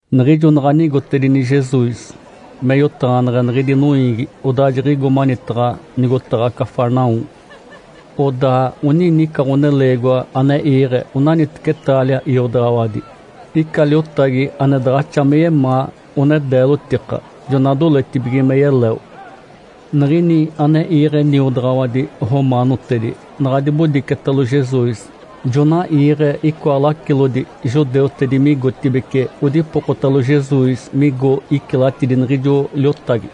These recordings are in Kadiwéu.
Niɡ̶ijo naɡ̶a nigotedini Jesus me yotaɡ̶aneɡ̶e niɡ̶idi noiigi, odaa jiɡ̶igo manitaɡ̶a nigotaɡ̶a Cafarnaum. Odaa oninica ɡ̶oneleegiwa ane iiɡ̶e onaniteci taalia iodaɡ̶awadi. Ica liotagi ane daɡ̶axa me yemaa, one deelotika, jona doletibige me yeleo. Niɡ̶ini ane iiɡ̶e niodaɡ̶awadi romaanotedi naɡ̶a dibodicetalo Jesus, jona iiɡ̶e icoa lacilodi judeutedi migotibeci odipokotalo Jesus migo icilatidi niɡ̶ijo liotagi.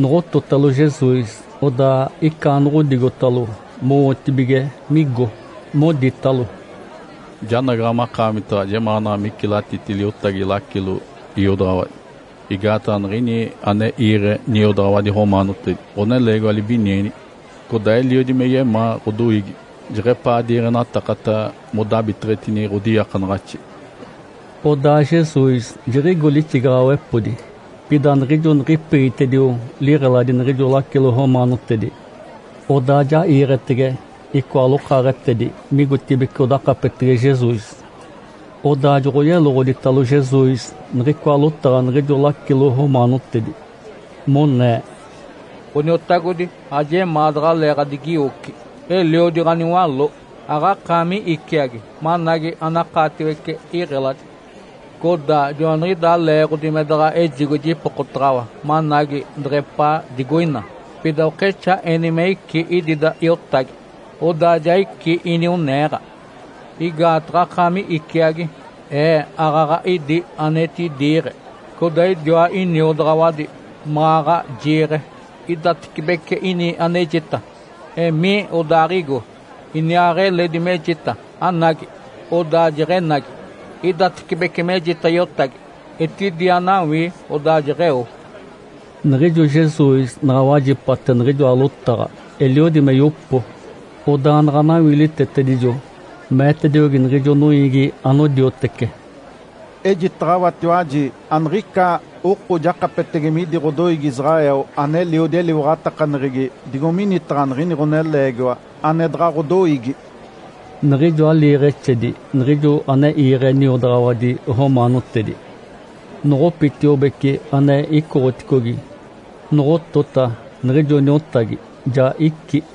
Noɡ̶ototalo Jesus, odaa icaanoɡ̶odigotalo mowotibige migo, moditalo, “Janagaɡ̶a makaamitaɡ̶a, jemaanaɡ̶a micilatiti liotagi lacilo iodaɡ̶awadi, igaataɡ̶a niɡ̶ini ane iiɡ̶e niodaɡ̶awadi romaanotedi, ɡ̶oneleegiwa libinienigi. Codaa eliodi me yemaa ɡ̶odoiigi, jeɡ̶epaa diiɡ̶enatakata modabiteɡ̶etini ɡ̶odiiakanaɡ̶axi.” Odaa Jesus jiɡ̶igo lixigaɡ̶awepodi. Pida niɡ̶ijo niɡ̶ipegitedio liɡ̶eladi niɡ̶ijo lacilo romaanotedi, odaa ja iiɡ̶etege icoa lokaaɡ̶etedi migotibeci odakapetege Jesus. Odaa joɡ̶oyeloɡ̶oditalo Jesus niɡ̶icoa lotaɡ̶a niɡ̶ijo lacilo romaanotedi, monee, “Ǥoniotagodi, ajemaa daɡ̶alee ɡ̶adigiwoci. Eliodi ɡ̶aniwaló, aɡ̶akaami iciagi managi anakaatiwece iɡ̶eladi. Codaa joaniɡ̶idaa leeɡ̶odi me daɡ̶a ejigo jipokotaɡ̶awa managi deɡ̶epaa digoina. Pida okexaa eni me icí idida iotagi, odaa ja icí inioneeɡ̶a. Igaataɡ̶a akaami iciagi, ee aaɡ̶aɡ̶a idi anetidiiɡ̶e, codaa idiwa iniodaɡ̶awadi maɡ̶aɡ̶a jiiɡ̶e. Idatecibece ini anejita, ‘Emii’, odaaɡ̶igo. Iniaaɡ̶eledi mejita, ‘Anagi’, odaa jeɡ̶enagi. Idatecibece mejita iotagi, ‘Etidi anawii.’ Odaa jeɡ̶eo.” Niɡ̶ijo Jesus naɡ̶a wajipate niɡ̶ijoa lotaɡ̶a, eliodi me yopo. Odaa naɡ̶a nawiilitetedijo, meetediogi niɡ̶ijo noiigi anodiotece, “Ejitaɡ̶awatiwaji, aniɡ̶ica oko jakapetege midi ɡ̶odoiigi Israel ane eliodi eliwaɡ̶atakaneɡ̶egi digo minitaɡ̶a niɡ̶ini ɡ̶oneleegiwa (ane daɡ̶a ɡ̶odoiigi).” Niɡ̶ijoa liiɡ̶exedi niɡ̶ijo ane iiɡ̶e niodaɡ̶awadi romaanotedi, noɡ̶opitiobeci ane icoɡ̶oticogi. Noɡ̶otota, niɡ̶ijo niotagi ja icí.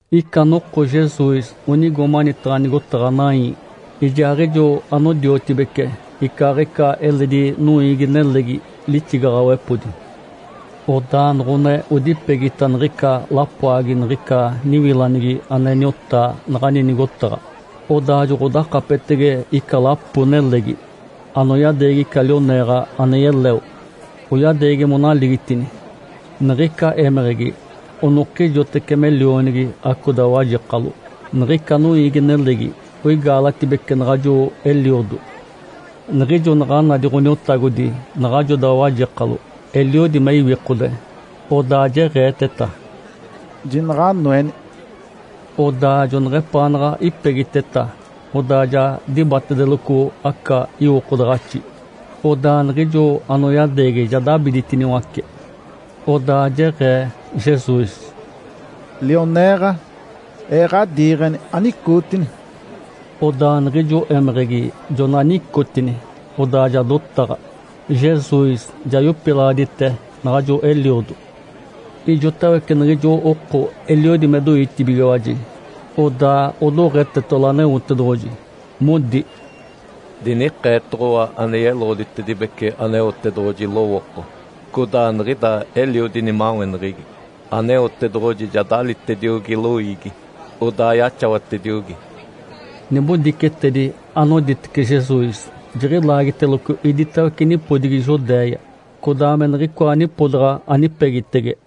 Ica noko Jesus onigo manitaɡ̶a nigotaɡ̶a Naim. Ijaaɡ̶ijo anodiotibece icaaɡ̶ica eledi noiigi-nelegi lixigaɡ̶awepodi. Odaa noɡ̶one odipegita niɡ̶ica lapoagi niɡ̶ica niwilanigi ane niotaa naɡ̶ani nigotaɡ̶a, odaa joɡ̶odakapetetege ica lapo-nelegi, anoyadeegi ica lioneeɡ̶a ane yeleo, oyadeegi monaligitini. Niɡ̶ica émeɡ̶egi onokijoteci me lionigi acoda wajekalo. Niɡ̶ica noiigi-nelegi oigaalatibece naɡ̶ajo eliodo. Niɡ̶ijo naɡ̶a nadi Ǥoniotagodi naɡ̶ajoda wajekalo, eliodi me iwikode. Odaa jeɡ̶eeteta, “Jinaɡ̶a anoeni!” Odaa joneɡ̶epaanaɡ̶a ipegiteta, odaa ja dibatedeloco aca iwokodaɡ̶axi. Odaa niɡ̶ijo anoyadeegi ja dabiditiniwace. Odaa jeɡ̶ee Jesus, “Lioneeɡ̶a, Ee ɡ̶adiiɡ̶eni, anicootini!” Odaa niɡ̶ijo émeɡ̶egi jona nicotini, odaa ja dotaɡ̶a. Jesus ja yopilaɡ̶adite naɡ̶ajo eliodo. Ijotawece niɡ̶ijo oko eliodi me doitibigiwaji, odaa odoɡ̶etetalo Aneotedoɡ̶oji, modi, “Dinikeetoɡ̶owa ane yeloɡ̶oditedibece Aneotedoɡ̶oji lowooko, codaa niɡ̶ida eliodi nimaweneɡ̶egi. Aneotedoɡ̶oji ja dalitediogi loiigi, odaa yaxawatediogi!” Nibodicetedi anoditece Jesus jiɡ̶ilaagiteloco iditawece nipodigi Judéia, codaa me niɡ̶icoa nipodaɡ̶a anipegitege.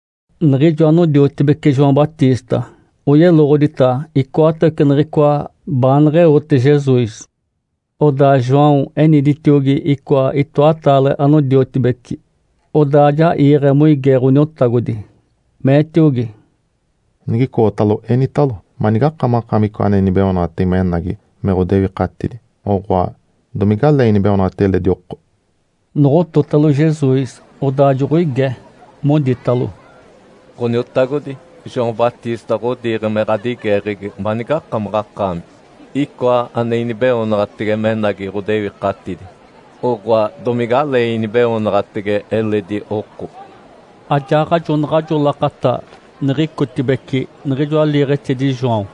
Niɡ̶ijo anodiotibeci João Batista oyeloɡ̶odita icoatawece niɡ̶icoa baaneɡ̶eote Jesus. Odaa João eniditiogi icoa itoataale anodiotibeci, odaa ja iiɡ̶e moige Ǥoniotagodi, meetiogi, “Nigicootalo, enitalo, ‘Manigakamaɡ̶akaami icoa ane inibeoonaɡ̶atege menagi me ɡ̶odewikatidi, oɡ̶oa, domigalee inibeoonaɡ̶atege eledi oko?’” Noɡ̶ototalo Jesus, odaa joɡ̶oige, moditalo, “Ǥoniotagodi, João Batista ɡ̶odiiɡ̶e me ɡ̶adigeeɡ̶egi manigakamaɡ̶akaami icoa ane inibeoonaɡ̶atege menagi ɡ̶odewikatidi, oɡ̶oa, domigalee inibeoonaɡ̶atege eledi oko?” Ajaaɡ̶ajo naɡ̶ajo lakata niɡ̶icotibeci niɡ̶ijoa liiɡ̶exedi João,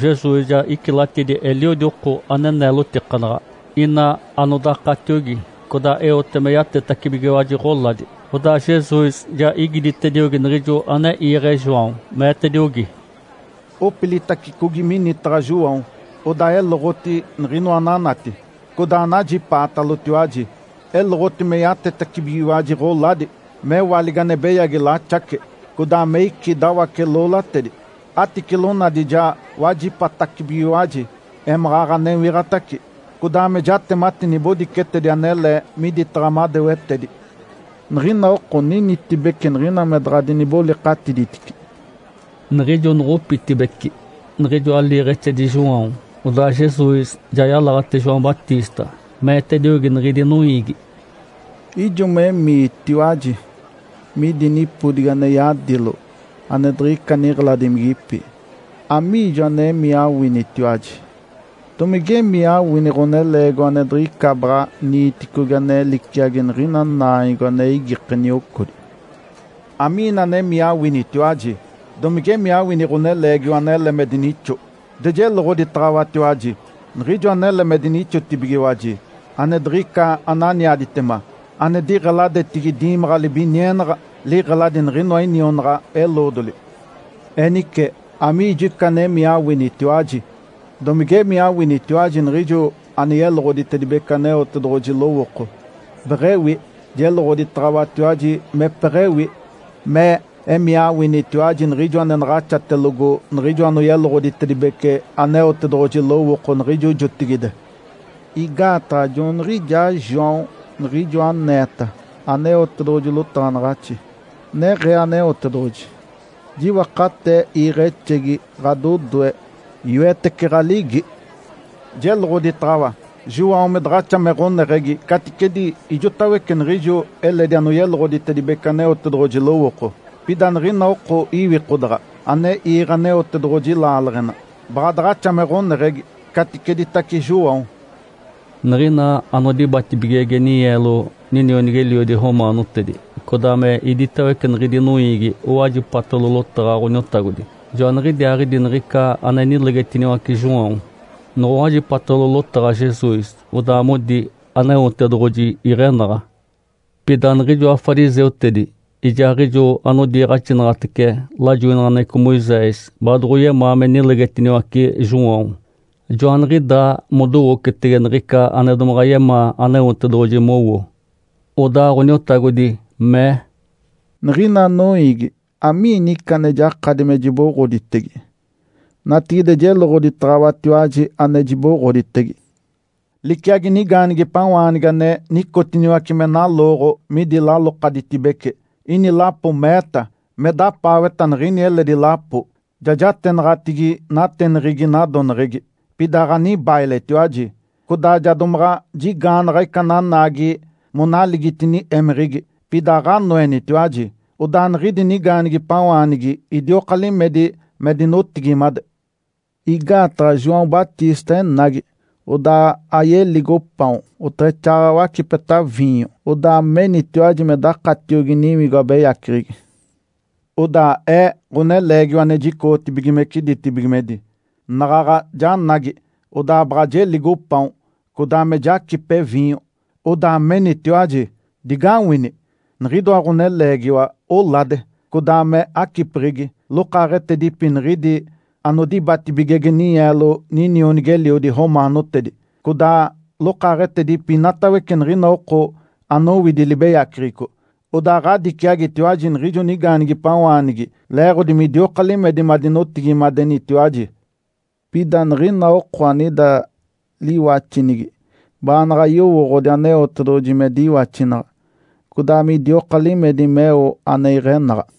Jesus ja icilatidi eliodi oko ane neelotikanaɡ̶a, ina anodakatiogi, codaa eote me yatetacibigiwaji ɡ̶oladi. Odaa Jesus ja igiditediogi niɡ̶ijo ane iiɡ̶e João, meetediogi, “Opilitacicogi minitaɡ̶a João, odaa eloɡ̶oti niɡ̶inoa ananati, codaa anajipaatalotiwaji. Eloɡ̶oti me yatetacibigiwaji ɡ̶oladi, mewaligi ane beyagi laxace, codaa me icí dawace-loolatedi, aticilonadi ja wajipatacibigiwaji, émaɡ̶aɡ̶a newiɡ̶atace, codaa me jatemati nibodicetedi anele miditaɡ̶a madewetedi. Niɡ̶ina oko ninitibece niɡ̶ina me daɡ̶a dinibolikatiditici.” Niɡ̶ijo noɡ̶opitibeci niɡ̶ijoa liiɡ̶exedi João, odaa Jesus ja yalaɡ̶ate João Batista, meetediogi niɡ̶idi noiigi, “Ijo me emiitiwaji midi nipodigi ane yadilo ane diɡ̶ica niɡ̶eladimigipi, amiijo anemii awinitiwaji? Domigemii mawini ɡ̶oneleegiwa ane diɡ̶ica baɡ̶a niiticogi ane liciagi niɡ̶ina naanyogo ane igike niocodi? Amiina anemii awinitiwaji? Domigemii awini ɡ̶oneleegiwa anele me dinixo? De jeloɡ̶oditaɡ̶awatiwaji! Niɡ̶ijo anele me dinixotibigiwaji, ane diɡ̶ica ananiaditema, ane diɡ̶eladetigi diimaɡ̶a libinienaɡ̶a, liɡ̶eladi niɡ̶inoa inionaɡ̶a-eloodoli. Enice, amiijo ica anemii awinitiwaji? Domige emii awinitiwaji niɡ̶ijo ane yeloɡ̶oditedibece Aneotedoɡ̶oji lowooko? Beɡ̶ewi! Jeloɡ̶oditaɡ̶awatiwaji mepeɡ̶ewi me emii awinitiwaji niɡ̶ijo ane naɡ̶axatelogo niɡ̶ijo anoyeloɡ̶oditedibece Aneotedoɡ̶oji lowooko niɡ̶ijo jotigide. Igaataɡ̶a joaniɡ̶ijaa João niɡ̶ijo aneeta Aneotedoɡ̶oji lotaɡ̶anaɡ̶axi, neɡ̶ee Aneotedoɡ̶oji, ‘Jiwakatee iiɡ̶exegi ɡ̶adodoe, yoetece ɡ̶aligi’. Jeloɡ̶oditaɡ̶awa, João me daɡ̶axa me ɡ̶oneɡ̶egi caticedi ijotawece niɡ̶ijo eledi anoyeloɡ̶oditedibece Aneotedoɡ̶oji lowooko. Pida niɡ̶ina oko iwikodaɡ̶a ane iiɡ̶e Aneotedoɡ̶oji laaleɡ̶ena, baɡ̶a daɡ̶axa me ɡ̶oneɡ̶egi caticeditace João.” Niɡ̶ina anodibatibigege ninyeelo ninionigi-eliodi romaanotedi, codaa me iditawece niɡ̶idi noiigi owajipatalo lotaɡ̶a Ǥoniotagodi, joaniɡ̶idiaaɡ̶idi niɡ̶ica ane nilegetiniwace João, noɡ̶owajipatalo lotaɡ̶a Jesus, odaa modi Aneotedoɡ̶oji iɡ̶enaɡ̶a. Pida niɡ̶ijoa fariseutedi ijaaɡ̶ijo anodiiɡ̶axinaɡ̶atece lajoinaɡ̶aneɡ̶eco Moisés baadoɡ̶oyemaa me nilegetiniwace João. Joaniɡ̶idaa modowocetege niɡ̶ica ane domaɡ̶a yemaa Aneotedoɡ̶oji mowo. Odaa Ǥoniotagodi mee, “Niɡ̶ina noiigi, amiini ica ane jakadi me jiboɡ̶oditege? Natigide jeloɡ̶oditaɡ̶awatiwaji ane jiboɡ̶oditege. Liciagi nigaanigipawaanigi ane nicotiniwace me nalooɡ̶o midi lalokaditibece. Ini lapo meeta, me dapaaweta niɡ̶ini eledi lapo, ‘Ja jatenaɡ̶atigi nateneɡ̶egi nadoneɡ̶egi, pida aɡ̶anibailetiwaji. Codaa ja domaɡ̶a jigaanaɡ̶a ica nanaagi monaligitini émeɡ̶egi, pida aɡ̶anoenitiwaji’. (Odaa niɡ̶idi nigaanigipawaanigi idioka limedi me dinotigimade.) Igaataɡ̶a João Batista enagi, odaa ayeligo paon, oteɡ̶exaaɡ̶aɡ̶a wacipeta viinyo. Odaa menitiwaji me dakatiogi niwigo abeyaceɡ̶egi. Odaa Ee, Ǥoneleegiwa ane jicoɡ̶otibigimece ditibigimedi, naɡ̶aɡ̶a janagi, odaa baɡ̶a jeligo paon, codaa me jacipe viinyo. Odaa menitiwaji, ‘Digawini! Niɡ̶idoa ɡ̶oneleegiwa olade, codaa me acipeɡ̶egi. Lokaaɡ̶etedipi niɡ̶idi anodibatibigege ninyeelo ninionigi-eliodi romaanotedi, codaa lokaaɡ̶etedipi inatawece niɡ̶ina oko anowidi libeyaceɡ̶eco!’ (Odaa ɡ̶adiciagitiwaji niɡ̶ijo nigaanigipawaanigi leeɡ̶odi midioka limedi madinotigimadenitiwaji.) Pida niɡ̶ina oko anida liwaxinigi, baanaɡ̶a yowooɡ̶odi Aneotedoɡ̶oji me diwaxinaɡ̶a, codaa midioka limedi meo ane iɡ̶enaɡ̶a.”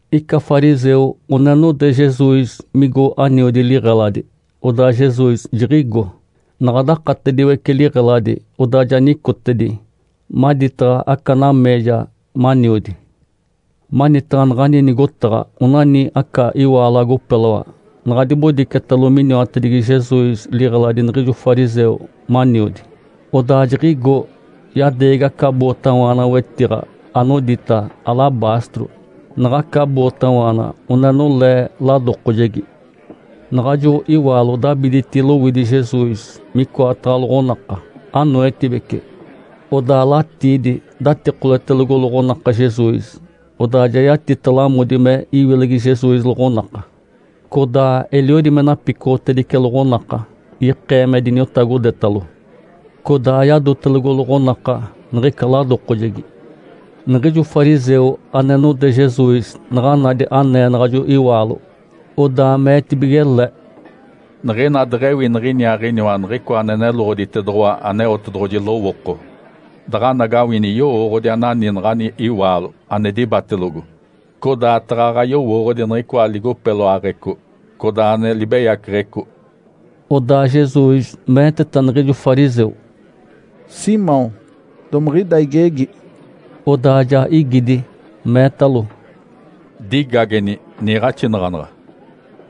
Ica fariseu one node Jesus migo aniodi liɡ̶eladi. Odaa Jesus jiɡ̶igo. Naɡ̶a dakatediwece liɡ̶eladi, odaa ja nicotedi maditaɡ̶a aca nameeja maniodi. Manitaɡ̶a naɡ̶ani nigotaɡ̶a onani aca iwaalo agopeloa. Naɡ̶a dibodicetalo miniwatedigi Jesus liɡ̶eladi niɡ̶ijo fariseu maniodi, odaa jiɡ̶igo, yadeegi aca bootawaana wetiɡ̶a, anodita “alabastro”. Naɡ̶aca bootawaana one nolee ladokojegi. Naɡ̶ajo iwaalo dabiditi lowidi Jesus micoataɡ̶a loɡ̶onaka, anoetibece. Odaa latiidi datikoletelogo loɡ̶onaka Jesus. Odaa ja yatita lamodi me iwilegi Jesus loɡ̶onaka, codaa eliodi me napicoɡ̶otedice loɡ̶onaka, ikee me diniotagodetalo. Codaa yadotelogo loɡ̶onaka niɡ̶ica ladokojegi. Niɡ̶ijo fariseu ane node Jesus naɡ̶a nadi anee naɡ̶ajo iwaalo, odaa meetibige le, “Niɡ̶ina deɡ̶ewi niɡ̶iniaaɡ̶iniwa Niɡ̶icoa ane neloɡ̶oditedoɡ̶owa Aneotedoɡ̶oji lowooko, daɡ̶anagawini yowooɡ̶odi anani naɡ̶ani iwaalo ane dibatelogo, codaa taɡ̶aɡ̶a yowooɡ̶odi niɡ̶icoa ligopeloaɡ̶eco, codaa ane libeyaceɡ̶eco.” Odaa Jesus meeteta niɡ̶ijo fariseu, “Simão, domiɡ̶ida igegi.” Odaa ja igidi, meetalo, “Digageni, niiɡ̶axinaɡ̶anaɡ̶a.”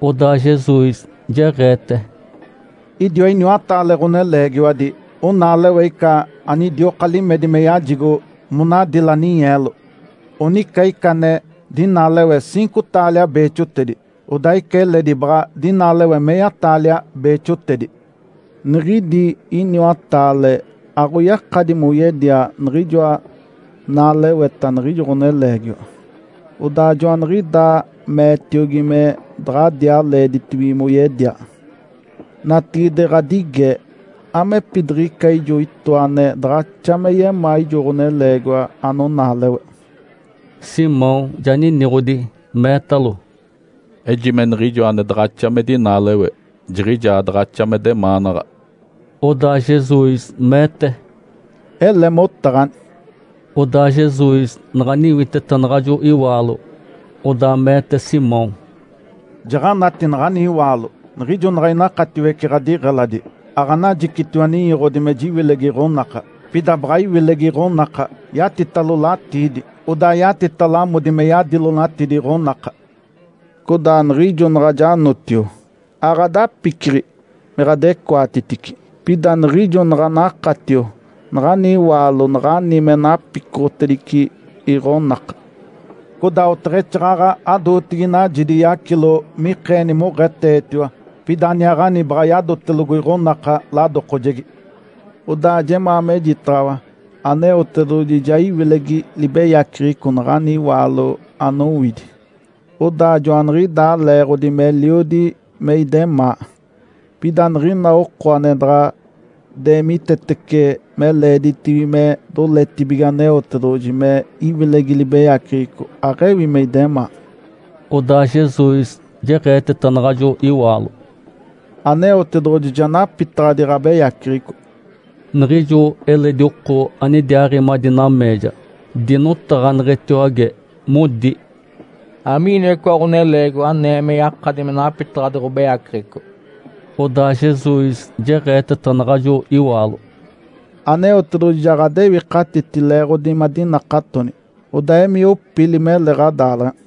Odaa Jesus jeɡ̶eete, “Idiwa iniwataale ɡ̶oneleegiwadi onaalewe ica anidioka limedi me yajigo monadila ninyeelo. Onica ica ane dinaalewe ciinco taalia beexotedi, odaa ica eledi baɡ̶a dinaalewe meya-taalia beexotedi. Niɡ̶idi iniwataale aɡ̶oyakadi moyedia niɡ̶ijoa naaleweta niɡ̶ijo ɡ̶oneleegiwa. Odaa joaniɡ̶idaa meetiogi me daɡ̶adiaa leeditibige moyedia. Natigide ɡ̶adige, amepidiɡ̶ica ijoa itoa ane daɡ̶axa me yemaa ijo ɡ̶oneleegiwa anonaalewe?” Simão ja niniɡ̶odi, meetalo, “Ejime niɡ̶ijo ane daɡ̶axa me dinaalewe jiɡ̶ijaa daɡ̶axa me demaanaɡ̶a.” Odaa Jesus meete, “Ele motaɡ̶ani!” Odaa Jesus naɡ̶a niwiteta naɡ̶ajo iwaalo, odaa meete Simão, “Jaɡ̶anati naɡ̶ani iwaalo. Niɡ̶ijo naɡ̶a inakatiwece ɡ̶adiɡ̶eladi, aɡ̶anajicitiwa ninyoɡ̶odi me jiwilegi iɡ̶onaka. Pida baɡ̶a iwilegi iɡ̶onaka yatitalo latiidi, odaa yatita lamodi me yadilonatidi iɡ̶onaka. Codaa niɡ̶ijo naɡ̶a janotio, aɡ̶adapiciɡ̶i me ɡ̶adecoatitici. Pida niɡ̶ijo naɡ̶a nakatio, naɡ̶ani iwaalo naɡ̶ani me napicoɡ̶otedice iɡ̶onaka. Codaa oteɡ̶exaaɡ̶aɡ̶a adootigi najidi yacilo mikeeni moɡ̶eetetiwa, pida aniaaɡ̶ani baɡ̶a yadotelogo iɡ̶onaka ladokojegi. Odaa jemaa mejitaɡ̶awa Aneotedoɡ̶oji ja iwilegi libeyaceɡ̶eco naɡ̶ani iwaalo anowidi. Odaa joaniɡ̶idaa leeɡ̶odi meliodi me idemaa. Pida niɡ̶ina oko ane daɡ̶a deemitetece me leeditibige me doletibige Aneotedoɡ̶oji me iwilegi libeyaceɡ̶eco, aɡ̶ewi me idemaa.” Odaa Jesus jeɡ̶eeteta naɡ̶ajo iwaalo, “Aneotedoɡ̶oji ja napitaɡ̶adi ɡ̶abeyaceɡ̶eco.” Niɡ̶ijo eledi oko anidiaaɡ̶i madi nameeja, dinotaɡ̶aneɡ̶etiwage, modi, “Amiiniwa icoa ɡ̶oneleegiwa anee me yakadi me napitaɡ̶adi ɡ̶obeyaceɡ̶eco?” Odaa Jesus jeɡ̶eeteta naɡ̶ajo iwaalo, “Aneotedoɡ̶oji ja ɡ̶adewikatiti leeɡ̶odi madinakatoni. Odaa emii opili, mele ɡ̶adaaleɡ̶ena!”